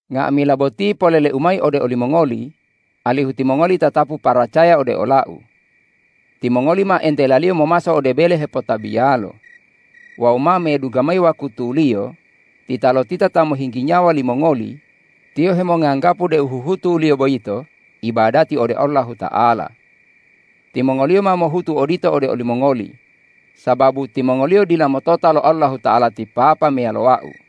Nga'amila boti polele-U mayi ode olimongoli alihu timongoli tatapu paracaya ode ola-U. Timongoli ma entelaliyo momaso ode bele hepotabiyalo. Wawu ma medungga mayi wakutuliyo, titalotita ta mohinggi nyawa limongoli, tiyo hemonganggapu deu huhutuliyo boyito ibadati ode Allahuta'ala. Timongoliyo ma mohutu odito ode olimongoli, sababu timongoliyo dila motota lo Allahuta'ala ti Papa meyalo Wau.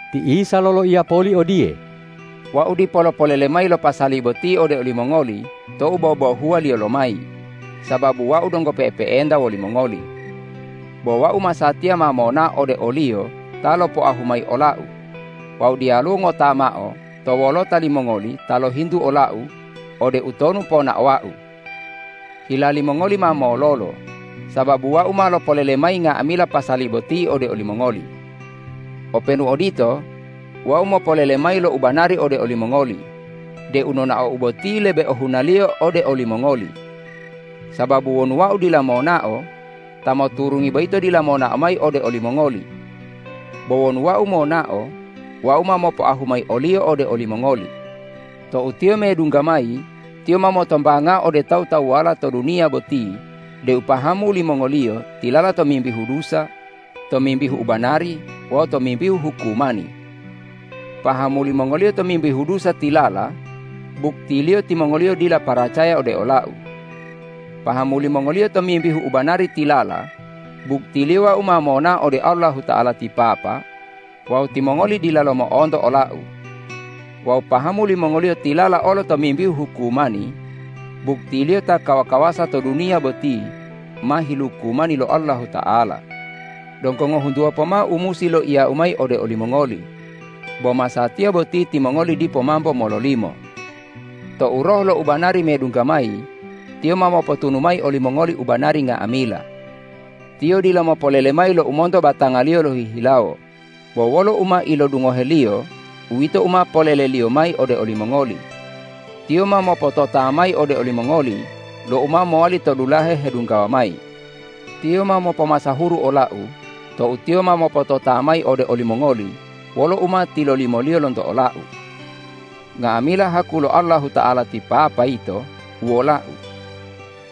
Ti Isa loloiya poli odiye,”Wau dipo lopolele mayi lo pasali boti ode olimongoli tou bobohuwaliyo mayi, sababu Wau donggo pe'epe'enta wolimongoli. Bo Wau masatiya ma monao ode o-Liyo ta lopoahu mayi ola-U; wawu diyaluwo ngota mao to wolota limongoli ta lohintu ola-U, ode utonu ponaowa-U. Hila limongoli ma mololo, sababu Wau ma lopolele mayi nga'amila pasali boti ode olimongoli. Openu odito, Wau mopolele mayi lo u banari ode olimongoli deu nonao-U boti lebe ohunaliyo ode olimongoli. Sababu wonu Wau dila monao, Ta moturungi boyito dila monao mayi ode olimongoli. Bo wonu Wau monao, Wau ma mopoahu mayi o-Liyo ode olimongoli. Tou Tiyo medungga mayi, Tiyo ma motombangao ode tawu-tawuwala to duniya boti deu pahamu limongoliyo tilala tomimbihu dusa, tomimbihu ubanari wawu tomimbihu hukumani. Pahamu limongoliyo tomimbihu dusa tilala, buktiliyo timongoliyo dila paracaya ode ola-U; pahamu limongoliyo tomimbihu ubanari tilala, buktiliyo Wau ma monao ode Allahuta'ala ti Papa wawu timongoli dilalo mo'onto ola-U; wawu pahamu limongoliyo tilala olo tomimbihu hukumani, buktiliyo ta kawa-kawasa to duniya boti ma hilukumani lo Allahuta'ala. Donggo ngohuntuwa pomao u musi loiya-U mayi ode olimongoli, bo masatiya boti timongoli dipo mambo mololimo. Tou Roh lo ubanari medungga mayi, Tiyo ma mopotunu mayi olimongoli u banari nga'amila. Tiyo dila mopolele mayi lo u monto batanga-Liyo lohihilawo, bo wolo u ma ilodungohe-Liyo uwito u ma polele-Liyo mayi ode olimongoli. Tiyo ma mopotota mayi ode olimongoli lo u ma mowali to dulahe hedunggawa mayi. Tiyo ma mopomasahuru ola-U tou Tiyo ma mopotota mayi ode olimongoli wolo u ma tilolimo-Liyo lonto ola-U. Nga'amila haku lo Allahuta'ala ti Papa yito uwola-U.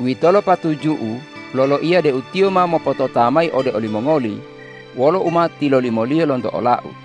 Uwitolo patuju-U loloiya deu Tiyo ma mopotota mayi ode olimongoli wolo u ma tilolimo-Liyo lonto ola-U.”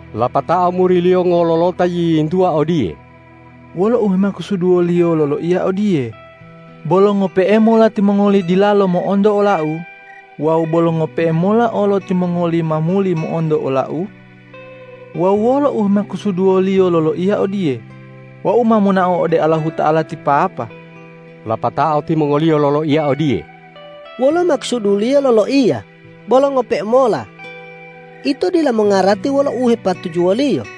Lapatao muri-Liyo ngololota yiyintuwa odiye,”Wolo u hemakusuduwo-Liyo loloiya odiye, ’Bolo ngope'e mola timongoli dilalo mo'onto ola-U wawu bolo ngope'e mola olo timongoli ma muli mo'onto ola-U?’ Wawu wolo u hemakusuduwo-Liyo loloiya odiye, ’Wau ma monao ode Allahuta'ala ti Papa?’” Lapatao timongoliyo loloiya odiye,”Wolo makusudu-Liyo loloiya, ’Bolo ngope'e mola?’ Ito dila mongarati wolo u hepatujuwo-Liyo.”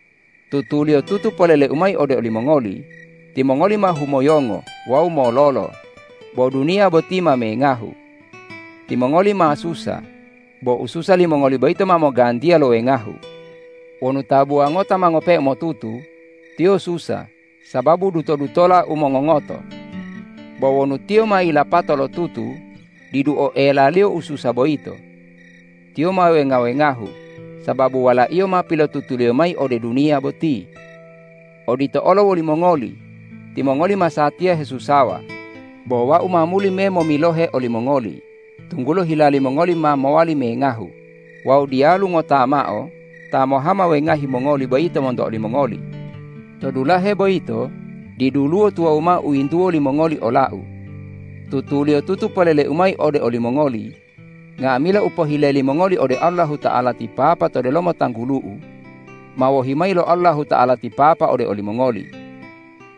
Tutuliyotutu polele-U mayi ode olimongoli: Timongoli ma humoyongo wawu mololo, bo duniya boti ma mengahu. Timongoli ma susa, bo ususa limongoli boyito ma mogantiya lo wengahu. Wonu tabuwa ngota ma ngope'e motutu, tiyo susa sababu duto-dutola u mongongoto. Bo wonu tiyo ma yilapato lotutu, didu oelaliyo ususa boyito. Tiyo ma wenga-wengahu sababu walaiyo ma pilotutuliyo mayi ode duniya boti. Odito olo wolimongoli. Timongoli masatiya hesusawa, bo Wau ma muli memomilohe olimongoli, tunggulo hila limongoli ma mowali mengahu wawu diyalu ngota mao ta mohama wengahi mongoli boyito monto olimongoli. To dulahe boyito diduluwo tuwawu mao u yintuwo limongoli ola-U. Tutuliyotutu polele-U mayi ode olimongoli: Nga'amila u pohile limongoli ode Allahuta'ala ti Papa to delomo tanggulu-U, ma wohi mayi lo Allahuta'ala ti Papa ode olimongoli.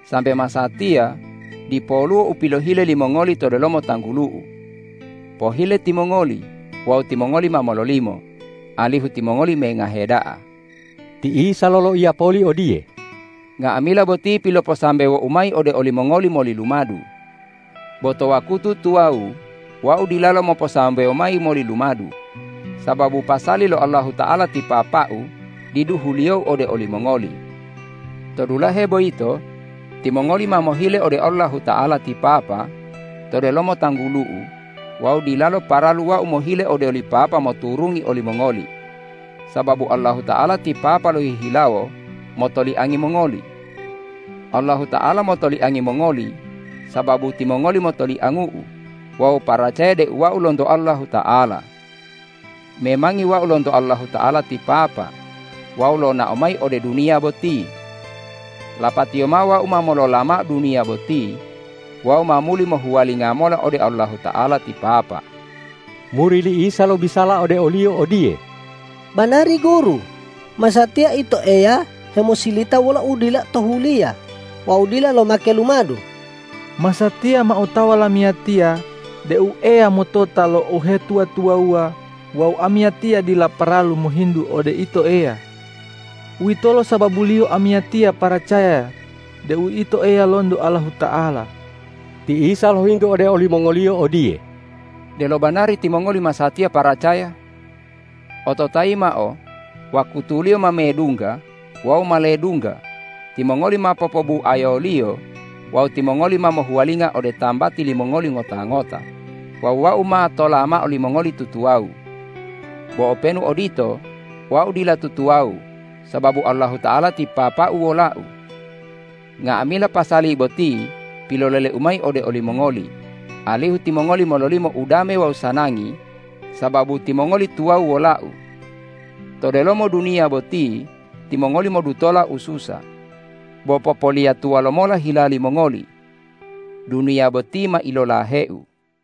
Sambe masatiya, dipoluwo u pilohile limongoli to delomo tanggulu-U. Pohile timongoli wawu timongoli ma mololimo, alihu timongoli mengahe da'a.” Ti Isa loloiya poli odiye,”Nga'amila boti piloposambewo-U mayi ode olimongoli moli lumadu. Bo to wakutu tuwawu Wau dilalo moposambewo mayi moli lumadu, sababu pasali lo Allahuta'ala ti Papa-U didu huliyo-U ode olimongoli. To dulahe boyito timongoli ma mohile ode Allahuta'ala ti Papa to delomo tanggulu-U wawu dilalo paralu Wau mohile ode oli Papa moturungi olimongoli, sababu Allahuta'ala ti Papa lohihilawo motoliangi mongoli. Allahuta'ala motoliangi mongoli sababu timongoli motoliangu-U wawu paracaya deu Wau lonto Allahuta'ala. Memangi Wau lonto Allahuta'ala ti Papa wawu lonao mayi ode duniya boti. Lapatiyo mao Wau ma molola mao duniya boti wawu ma muli mohuwalinga mola ode Allahuta'ala ti Papa.” Muri li Isa lobisala ode o-Liyo odiye,”Banari Guru, masatiya Ito Eya hemosilita wolo udila tohuliya wawu dila lomake lumadu. Masatiya ma otawa lamiyatiya deu Eya motota lo uhetuwa-tuwawuwa wawu amiyatiya dila paralu mohintu ode Ito Eya. Uwitolo sababuliyo amiyatiya paracaya deu Ito Eya lonto Allahuta'ala.” Ti Isa lohintu ode olimongoliyo odiye,”Delo banari timongoli masatiya paracaya? Ototayi mao, wakutuliyo ma medungga wawu ma ledungga, timongoli ma popobubuayoliyo wawu timongoli ma mohuwalinga ode tambati limongoli ngota-ngota wawu Wau ma tola mao limongoli tutuwawu. Bo openu odito, Wau dila tutuwawu sababu Allahuta'ala ti Papa-U wola-U. Nga'amila pasali boti pilolele-U mayi ode olimongoli, alihu timongoli mololimo udame wawu sanangi sababu timongoli tuwawu wola-U. To delomo duniya boti timongoli modutola ususa. Bo popoliyatuwa lomola hila limongoli! Duniya boti ma ilolahe-U!”